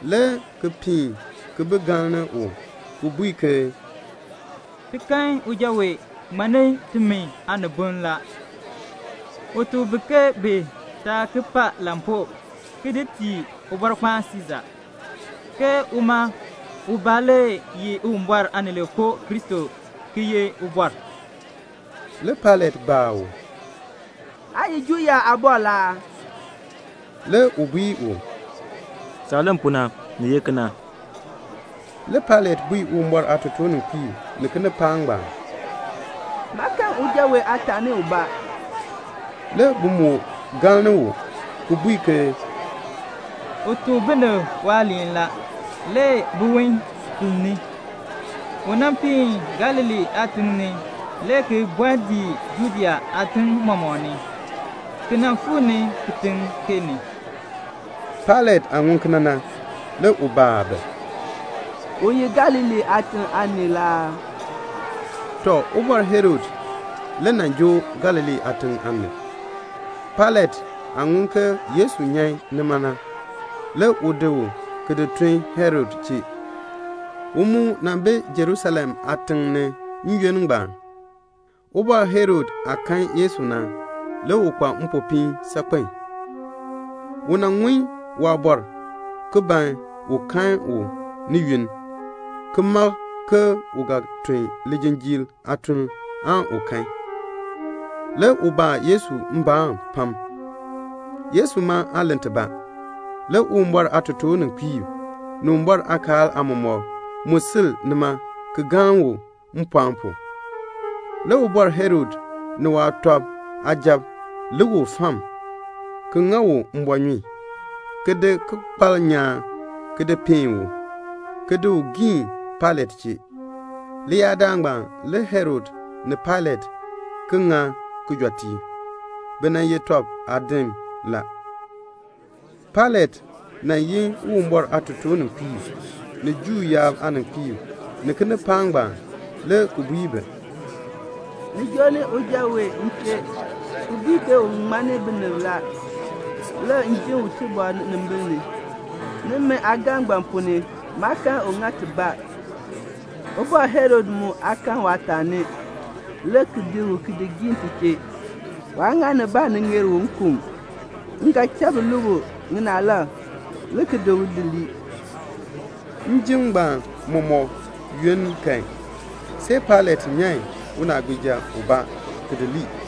le ki piin ki bi galni u, ki bui ke "Ti kan uja wee ŋmanni timi aaniboln la. U tuk bi ke bi taa ki pa lampuu ki di tii Ubɔrkpaan Siisa, ke uma ubaa le ye Uwumbɔr Aanileekoo Kristo ki ye Ubɔr." Le Pailat baa u, "Aa ye Juu yaab aabɔr la aa?" Le u bui u, "Saah len pu na, ni ye kena." Le Pailat bui Uwumbɔr aatotoorninkpiib ni kinipaak ngbaan, "Maa kan uja wee aataani ubaa." Le bi moo galni u, ki bui ke "U tuk binib waaliin la, le biwon filn. U nan piin Galilee aatiŋ ni, le ki bɔɔ dii Judea aatim mɔmɔk ni, ki nan fuu ni kitiŋ kee ni." Pailat aah ŋun kena na, le u baa bi, "U ye Galilee aatiŋ aanii la aa?" Tɔ, Ubɔr Herod le joo Galilee aatiŋ aanib. Pailat aah ŋun ke Yesu nyan nima na, le u di u ki di tun Herod chee. U mu bi Jerusalem aatiŋ ni n-yoonn ngbaan. Ubɔr Herod aah kan Yesu na, le u kpa mpopiin saakpen. U nan ŋun waabɔr la, ki ban un kan u ni yunn, ki mak ke u ga tun lijinjiir aatuln aan u kan. Le u baa Yesu mbaan pam. Yesu ma aa len tibaa. Le Uwumbɔr aatotoorninkpiib ni Uwumbɔr aakaal aamɔmɔkb mu sil nima ki galni u mpɔɔn pu. Le Ubɔr Herod ni waasujatiib lik u fam, ki ŋa u mbɔɔnyun, ki di bikpalb nyaan, ki di peen u, ki di u giin Pailat chee. Leyaadaal ngbaan le Herod ni Pailat ki ŋa tɔb kijɔteek. Bi nan ye tɔb aadim la. Le Pailat yin Uwumbɔr aatotoorninkpiib, ni Juu yaab aaninkpiib, ni kinipaak ngbaan, le ki bui bi, "Ni joo ni uja wee m chee, ki bui ke u ŋmanni binib la. Le m jin u tibɔr ninimbiin ni. Nimi aagaln ngbaan ponn ni maa kan u ŋa tibaa. Ubɔr Herod mu aa kan waataani, le u di u ki di giin ti chee. Waa ŋa nibaa ni ŋeer u nkun. M ga cha bi lue u ŋinaalab, le ki di u di lii." [ Njim ngbaan mɔmɔk yoonn kan, see Pailat nyan unaagbiija ubaa ki di lii.]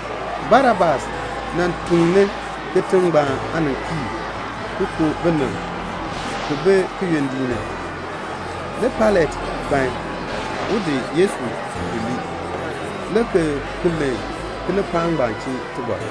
Barabas nan tukni kitiŋ ngbaan aaninkpiib, ki ku binib, ki bi kiyondiik ni. Le Pailat ban un di Yesu di lii, le ki ki len kinipaak ngbaan chee tibɔr.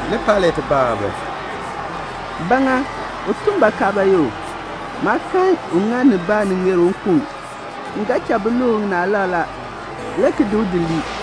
Le Pailat baa bi, "Ba ŋa? U tun bakaa bayoo? Maa kan u ŋa nibaa ni ŋeer u nkun. M ga cha bi lue u ŋinaalab la, le ki di u di lii."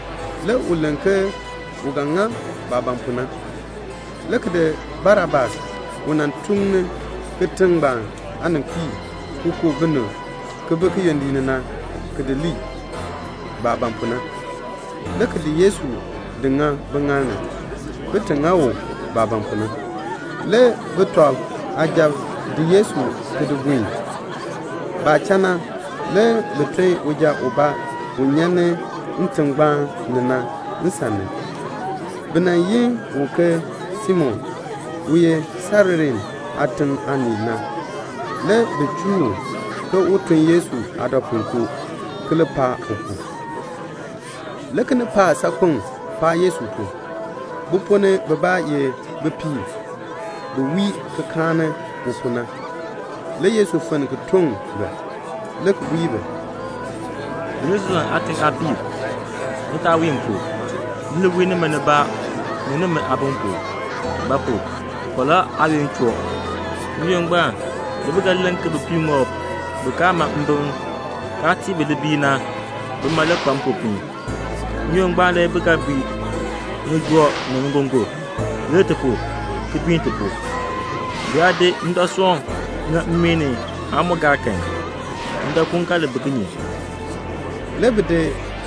Le u len ke u ga ŋa baah ban pu na, le ki di Barabas u nan tukni kitiŋ ngbaan aaninkpiib ki ku binib, ki bi kiyondiik ni na, ki di lii, baah ban pu na, le ki di Yesu ki di ŋa biŋaal ni, bin ti ŋa u baah ban pu na. Le sujatiib di Yesu ki di buen. Baah cha na, le bi ton uja ubaa u nyan ni ntingbaan ni na nsan ni. Bi yi u ke Simon, u ye Sairene aatiŋ aanii na. Le bi chuu u, ke un tun Yesu aadɔpuinkoo ki li paan u pu. Le kinipaak saakpeŋ paan Yesu pu. Bi ponn ni bibaa ye bipiib bi wii ki kaani u pu. Le Yesu fenn ki toŋ bi, le ki bui bi, "Jerusalem aatiŋ aapiib, ni taa wii m pu. Ni li wii nimi nibaa ni nimi aabim pu; ba pu? falaa aayoonn choo. N-yoonn ngbaan le bi ga len ke 'Bipiiŋoob bi kaa ma mbim kaa tii bi libiil na, bima le kpa mpopiin.' N-yoonn ngbaan le bi ga bui ŋijoo ni ŋigongon, 'Lir ti pu, ki biin timi.' Bi yaa see ndɔsoon mmii kan, bi ga tee ŋa ndɔkuun kinye?" Le bi di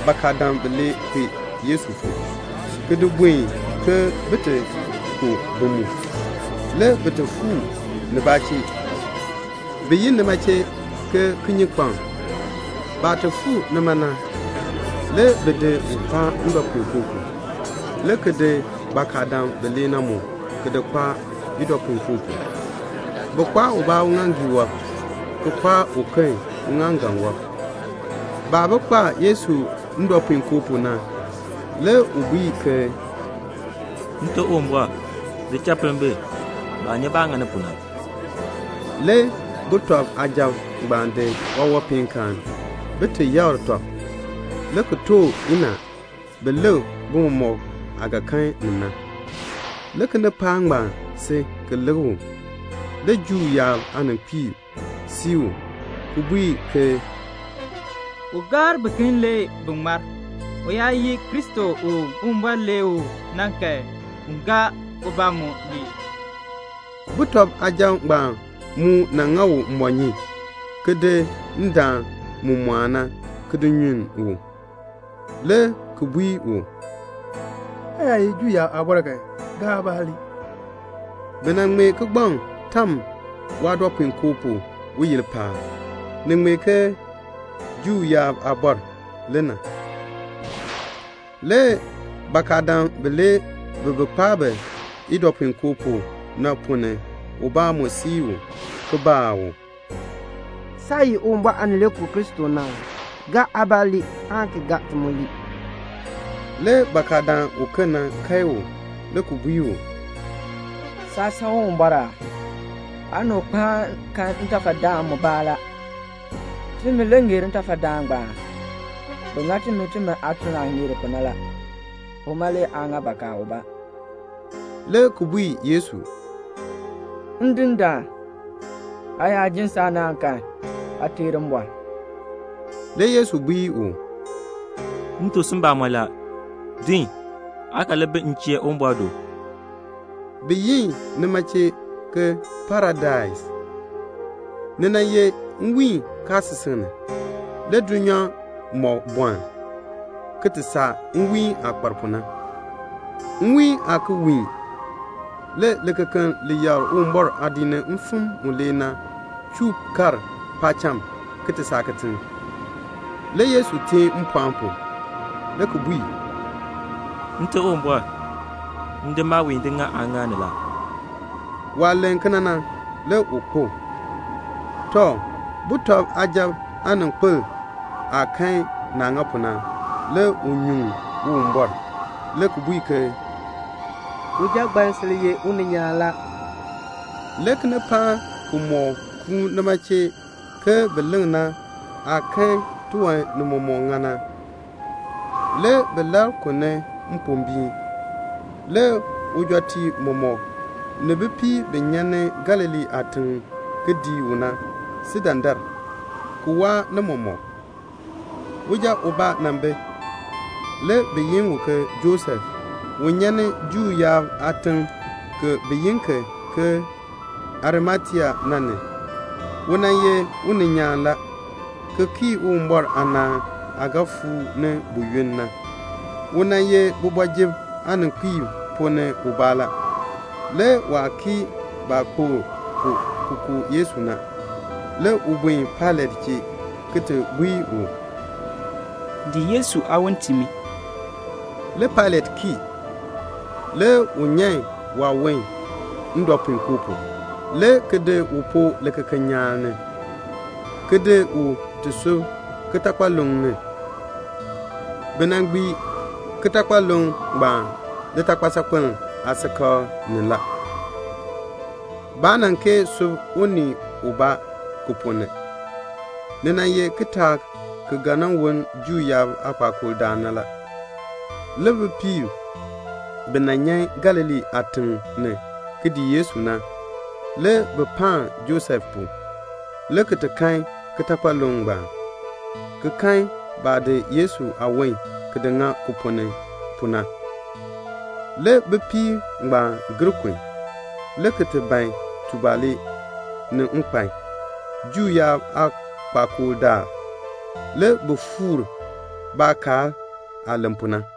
bakadam bilee, le ki di kpee Yesu pu, ki di buen ke bin ti ku bi mu. Le bi fuu nibaa chee, bi yi nima chee "Kiyikpaŋ." Baah ti fuu nima na, le bi di u ki di kpaa ndɔpuinkoo pu, le ki di bakadam bilee na mu, ki di kpaa idɔpuinkoo pu. Bi kpaa ubaa uŋaaŋgii wɔb, ki kpaa uken uŋaaŋgan wɔb. Baah bi kpaa Yesu ndɔpuinkoo pu na, le u bui ke, "Nte Uwumbɔr, di cha pinn bi. Baa nyi baah ŋani pu na." Le sujatiib ngbaan di waawanpeenkaan bin ti yakr tɔb, le ki too chacha bin lik bimɔk aah ga kan ni na. Le kinipaak ngbaan si ki lik u. Le Juu yaab aaninkpiib sii u, ki bui ke "U gaar biken le bi ŋmar; u yaa ye Kristo u Uwumbɔr lee u na kan, un gaa ubaa mu ki ŋmar." Sujatiib ngbaan mu ŋa u mbɔɔnyun, ki di ndaan mu mɔɔn na, ki di nyunn u, le ki bui u, "Aa yaa ye Juu yaab aabɔr kan, gaa aabaa ki ŋmar." Kigbaŋ mu tam waadɔpuinkoo pu, uyil paab. Ni ŋmee ke "Juu yaab Aabɔr le na." Le bakadam bilee bi bi kpaa bi idɔpuinkoo pu na ponn ni ubaa mu sii u, ki baa u, "Saa ye Uwumbɔr Aanileekoo Kristo na aa? Gaa aabaa ki ŋmar aan ki gaa ti mu ke ti ŋmar." Le bakadaan uken na kae u, le ki bui u, "Saa san Uwumbɔr aa? Aa ni u kpaan kan ntafadaan mubaa la. Timi le ŋeer ntafadaan ngbaan. Bi ŋa timi, timi aatuln aah ŋeer pu na. Uma le aa ŋa bakaa ubaa," le ki bui Yesu, "Ndindaan, aa yaa ji saanaan kan, aa teer mbɔr." Le Yesu bui u, "M tuk si mbamɔn la, din aa ga li bi m chee Uwumbɔr do." Bi yi nima ke Paradais. Ni nan ye nwiin kaasisik ni. Le dulnyaa mɔk bɔln, ki ti saa nwiin aah kpar pu na. Nwiin aa ki wiin. Le likekeln li yakr Uwumbɔr aadiik ni mfim mulee na chuu kar paacham, ki ti saa kitiŋ. Le Yesu teen mpɔɔn pu, le ki bui, "Nte Uwumbɔr, m di maawiin di ŋa aaŋaal ni la." Waah len kena na, le u kpo. Tɔ, sujatiib aaninkpil aah kan naah ŋa pu na, le u nyuŋ Uwumbɔr, le ki bui ke, "Uja ngbaan sil ye uninyaan la." Le kinipaak kimɔk kuun nima chee bin ti lik na, baah kan tiwan nimɔk ŋa na, le bi labr kun ni mpombiin. Le ujɔtiib mɔmɔk, ni bipiib bi nyan ni Galilee aatiŋ ki dii u na, bi si dandar, ki waa ni mɔmɔk. Uja ubaa nan bi, le bi yi u ke Josef u nyan Juu yaab aatiŋ kibaa, bi yi ki ke Arimatea na ni. U ye uninyaan la, ki kii Uwumbɔr aanaan aah ga fuu ni buyoonn na. U ye kooti ni aaninkpiib ponn ni ubaa la. Le waa kii baah kpokl pu ki ku Yesu na. Le u buen Pailat chee, le ki bui u, "Tiin mi Yesu aawon." Le Pailat kii. Le u nyan waawon ndɔpuinkoo pu, le ki di u ki di poo likekeln nyaan ni, ki di u ki ti di sub kitakpaluŋ ni. Bi nan gbii kitakpaluŋ ngbaan litakpal saakpiln aasikakl ni. Baa nan kee sub unii ubaa ki ponn ni. Ni ye kitaak ki ga woln Juu yaab aakpakool daal na la. Le bipiib bi nan nyan Galilee aatiŋ ni ki dii Yesu na, le bi paan Josef pu, le ki kan kitakpaluŋ ngbaan, ki kan baah di Yesu aawon ki di ŋa ki ponn ni pu na. Le bipiib ngbaan gir kun, le ki ti ban tubalee ni nkpan. Juu yaab aakpakool daal, le bi fuur baakaal aah len pu na.